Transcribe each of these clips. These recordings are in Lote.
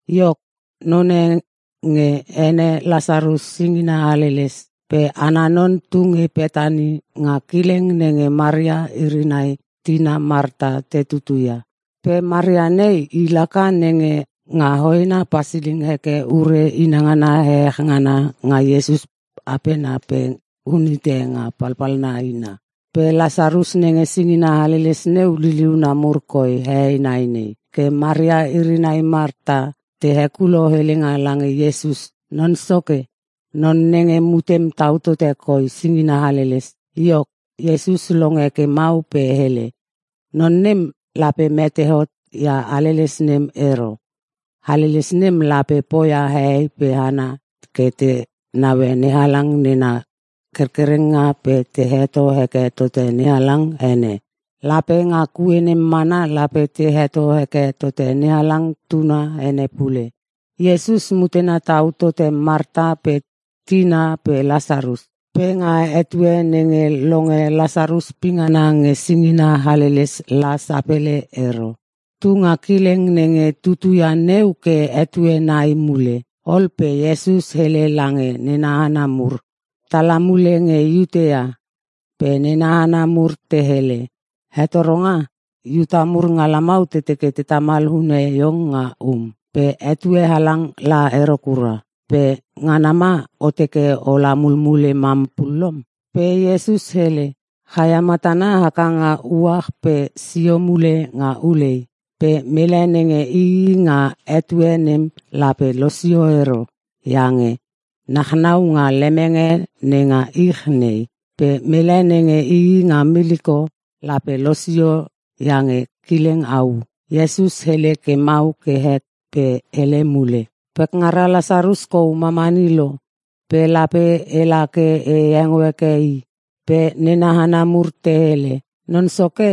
Iok, none nge ene Lasarus singina haleles. Pe ana non tu nge Petani nga kileng nenge Maria iri nai tina Marta te tutu ia. Pe Maria nei, i laka nenge nga hoena pasiling heke ure inangana ehech ngana nga Iesus apena pe unhite nga palpalna ina. Pe Lasarus nenge singina haleles neu, liliuna mur koi hehei nai nei. Ke Maria iri nai Marta te hekulo helenga lange Iesus, “Non Soke, non nenge mutem tau tote koi singina haleles.” Iok, Iesus longe ke mau pe hele, “Non nem lape mete hot ia haleles nem ero. Haleles nem lape poia hehei pe hana ke te naue NeHalang nena kerkerenga pe te heto heke tote NeHalang ene. Pe nga kue nem mana lape te heto heke tote NeHalang Tuna ene pule.” Iesus mutena tau tote Marta pe tina pe Lasarus. Pe nga etue nenge longe Lasarus pingana nge singina haleles la sapele ero. Tunga kileng nenge tutuia neu ke etue nai mule. Ol pe Iesus hele lange nena hana mur, “Tala mule nge Iutea.” Pe nena hana mur te hele, “Hetoronga, Iuta mur nga lamau te teke te tamal hune iong nga um. Pe etue halang la ero kura. Pe ngana ma o teke ola mulmule mam pulom?” Pe Iesus hele, “Chaia matana haka nga uach pe sio mule nga ulei. Pe mele nenge ii nga etue nem lape losio ero, iange nachnau nga lemenge nenga ich nei. Pe mele nenge ii nga miliko lape losio iange kileng au.” Iesus hele ke mau ke het pe hele mule, “Pekngara Lasarus kou mamani lo, pe lape ela ke e hengo heke i.” Pe nena hana mur te hele, “Non Soke,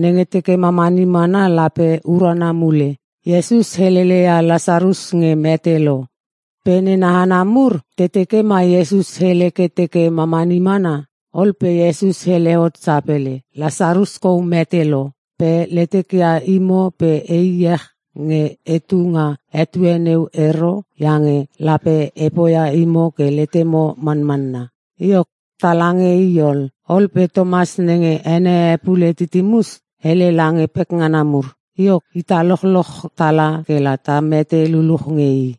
nenge teke mamani mana lape urana mule.” Iesus helele ia Lasarus nge mete lo, pe nena hana mur te teke ma Iesus hele ke teke mamani mana. Ol pe Iesus hele hot sapele, “Lasarus kou mete lo. Pe letekia imo pe e iech nge e tunga etue neu ero. Iange lape e poia imo ke letemo manmanna. Iok, tala nge i ol.” Ol pe Tomas (nenge ene e pule Titimus) hele lange pekngana mur, “Iok, ita lochloch tala kela ta mete luluch nge i.”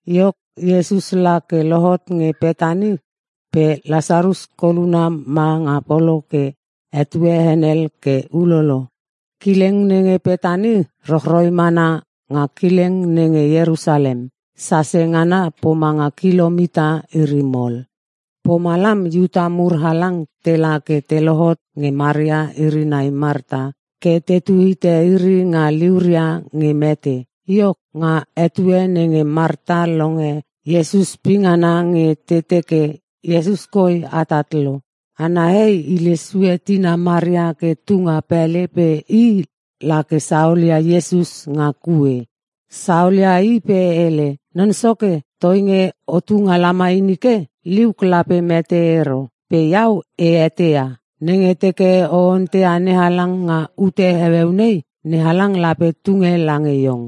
Iok, Iesus la ke lohot nge Petani pe Lasarus koluna ma nga polo ke etue henel ke ulolo. Kileng nenge Petani rochroi mana nga kileng nenge Ierusalem. (sase ngana pomanga kilomita iri mol) Pomalam Iuta mur halang tela ke te lohot nge Maria iri nai Marta ke tetu hite iri nga liuria nge mete. Iok, nga etue nenge Marta longe Iesus pingana nge te teke, “Iesus koi atat lo.” Ana hei hile sue tina Maria ke tunga pele pe i la ke saolia Iesus nga kue. Saolia i pe hele, “Non Soke, toinge o tunga lamai nike, liuk lape mete ero. Pe iau e eteia. Nenge teke o onteia NeHalang nga ute heueu nei, NeHalang lape tunge lange iong.”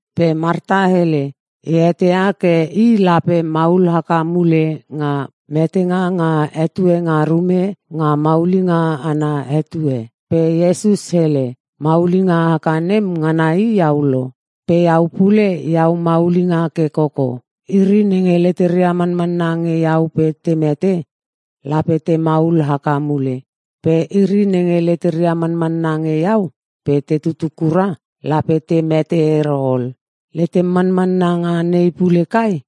Pe Marta hele, “E eteia ke i lape maul haka mule nga metenga nga etue nga rume, nga maulinga ana etue.” Pe Iesus hele, “Maulinga haka nem ngana i iau lo. Pe iau pule iau maulinga ke koko. Iri nenge leteria manmanna nge iau pe te mete, lape te maul haka mule. Pe iri nenge leteria manmanna nge iau (pe te tutu kura), lape te mete ero ol. Letem manmanna nga nei pule kai?”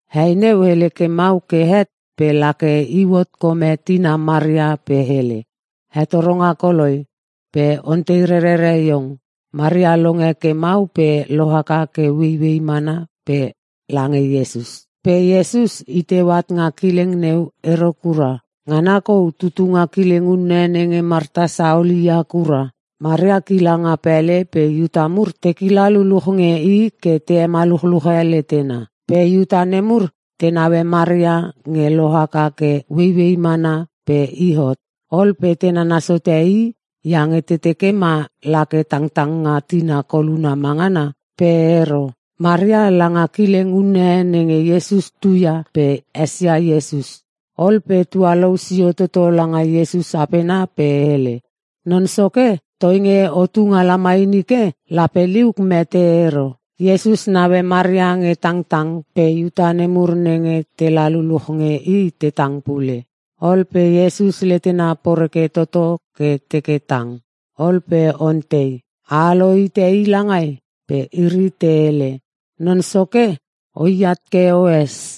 Hei neu hele ke mau ke het pe la ke iu hot kome tina Maria pe hele, “Hetoronga koloi, pe ontei rerere iong.” Maria longe ke mau pe lohaka ke ueiuei mana pe lange Iesus. Pe Iesus i teu at nga kileng neu ero kura. Ngana kou tutu nga kileng unne nenge Marta saol i ia kura. Maria kila nga pele pe Iuta mur te kila luchluch nge i ke te hemaluchluche letena. Pe Iuta nemur te naue Maria nge lohaka ke ueiuei mana pe i hot. Ol pe te nanas hote i iange te teke ma la ke tangtang nga tina koluna ma ngana. Pe ero. Maria langa kileng unne nenge Iesus tuia pe esia Iesus. Ol pe tualou sio toto langa Iesus apena pe hele, “Non Soke, toinge o tunga lamai nike, lape liuk mete ero.” Iesus naue Maria nge tangtang pe Iuta nemur nenge tela luluch nge i te tang pule. Ol pe Iesus letena poreke toto ke teke tang. Ol pe ontei, “A alo hite i langai?” Pe iri te hele, “Non Soke, oi at ke oes.”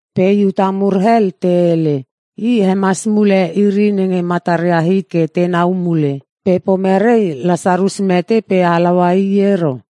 Pe Iuta mur hel te hele, “I hemas mule iri nenge mataria hit ke tenau mule. Pe pomerei Lasarus mete pe halaua i ero?”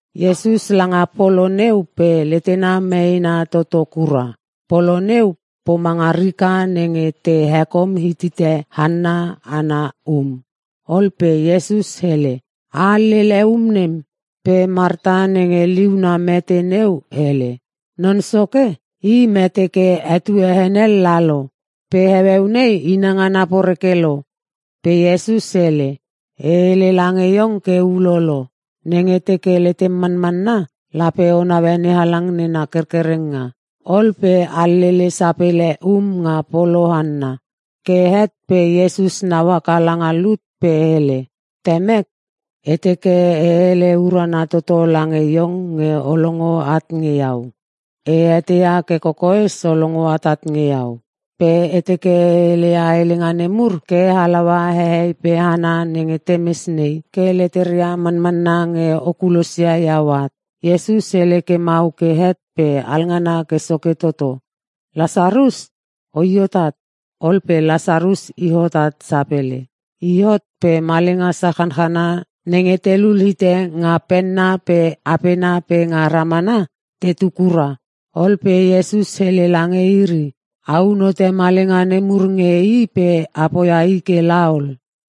Iesus langa polo neu pe letena meena toto kura. Polo neu pomanga rika nenge te hekom hitite hanna ana um. Ol pe Iesus hele, “A alele um nem.” Pe Marta nenge liuna mete neu hele, “Non Soke, i mete ke etue henel lalo. Pe heueu nei inangana poreke lo.” Pe Iesus hele, “E hele lange iong ke ulolo. Nenge teke letem manmanna lape o naue NeHalang nena kerkerenga.” Ol pe alele sapele um nga polo hanna. Ke het pe Iesus nau haka langa lut pe hele, “Temek, e teke e hele urana toto lange Iong nge o longo at nge iau. E eteia ke kokoes o longo atat nge iau. Pe e teke e heleia helenga nemur ke halaua hehei pe hana nenge temes nei, ke leteria manmanna nge o kulosia iau at.” Iesus hele ke mau ke het pe alngana ke soke toto, “Lasarus, oi hot at.” Ol pe Lasarus i hot at sapele. I hot pe malenga sachanchana nenge telul hite nga penna pe apena pe nga ramana tetu kura. Ol pe Iesus hele lange iri, “A unhote malenga nemur nge i pe a poia i kela ol.”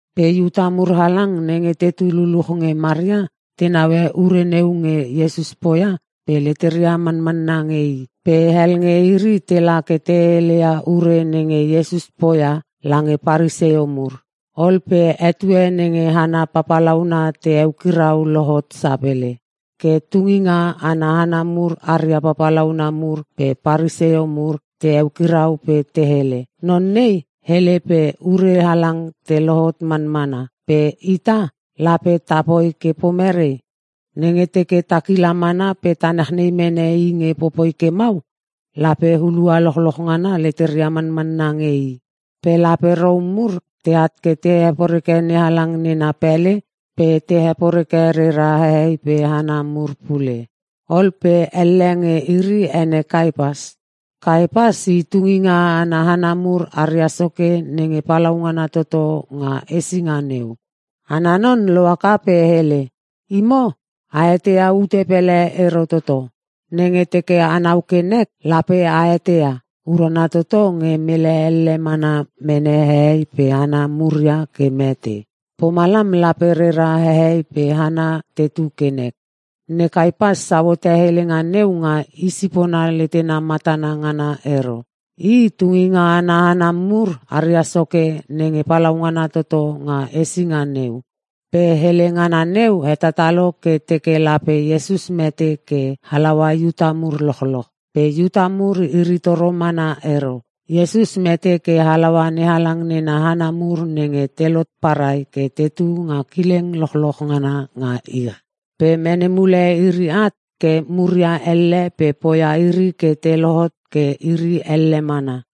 Pe Iuta mur halang nenge tetu luluch nge Maria te naue ure neu nge Iesus poia pe leteria manmanna nge i. Pe hel nge iri tela ke te heleia ure nenge Iesus poia lange Paresio mur. Ol pe etue nenge hana papalauna te eukirau lohot sapele. Ke tunginga ana hana mur aria papalauna mur pe Paresio mur te eukirau pe te hele, “Non nei hele pe ure halang te lohot manmana. Pe ita, lape tapoi ke merei? Nenge teke ta kila mana pe ta nachnei mene i nge popoi ke mau, lape hulua lochloch ngana leteria manmanna nge i. Pe lape Rom mur teat ke te heporeke NeHalang nena pele pe te heporeke rera hehei pe hana mur pule.” Ol pe elle nge iri ene Kaipas. Kaipas i tunginga ana hana mur aria soke nenge palaungana toto nga hesinga neu. Ana non lohaka pe hele, “Imo a eteia ute pele ero toto! Nenge teke anau ke nek lape a eteia. Urana toto nge mele elle mana mene hehei pe hana muria ke mete. Pomalam lape rera hehei pe hana tetu ke nek.” Ne Kaipas sau hote helenga neu nga i sipona letena matana ngana ero. I tunginga ana hana mur aria soke nenge palaungana toto nga hesinga neu. Pe hele ngana neu hetatalo ke teke lape Iesus mete ke halaua Iuta mur lochloch. Pe Iuta mur iri toro mana ero. Iesus mete ke halaua NeHalang nena hana mur nenge telot parai ke tetu nga kileng lochloch ngana nga ich, pe mene mule iri at ke muria elle pe poia iri ke te lohot ke iri elle mana.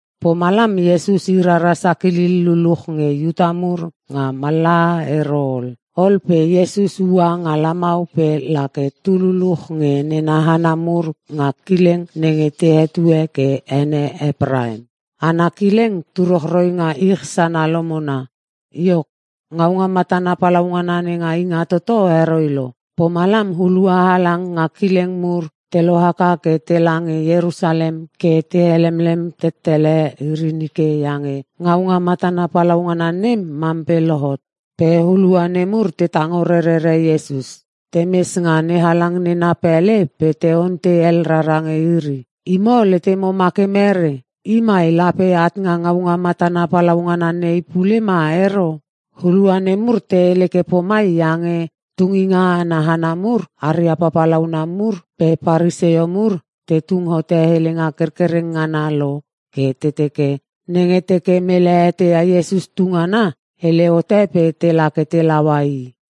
Pomalam Iesus i rara sakilil luluch nge Iuta mur nga mallaha ero ol. Ol pe Iesus ua nga lamau pe la ke tu luluch nge nena hana mur nga kileng nenge te hetue ke ene Epraim. Ana kileng tu rochroi nga ich sana lomona. Iok, ngaunga matana palaungana nenga Ingatoto heroi lo. Pomalam hulua halang nga kileng mur te lohaka ke tela nge Ierusalem ke te helemlem tettele iri nike, (iange ngaunga matana palaungana nem mam pe lohot.) Pe hulua nemur te tango rerere Iesus. Te mes nga NeHalang nena pele pe te ontei hel rara nge iri, “Imo letemo ma ke merei? I mai lape at nga ngaunga matana palaungana nei pule ma ero?” Hulua nemur te hele ke pomai iange tunginga ana hana mur, aria papalauna mur pe Paresio mur te tung hote helenga kerkereng ngana lo ke te teke, nenge teke mele eteia Iesus tu ngana, hele hote pe tela ke te laua i.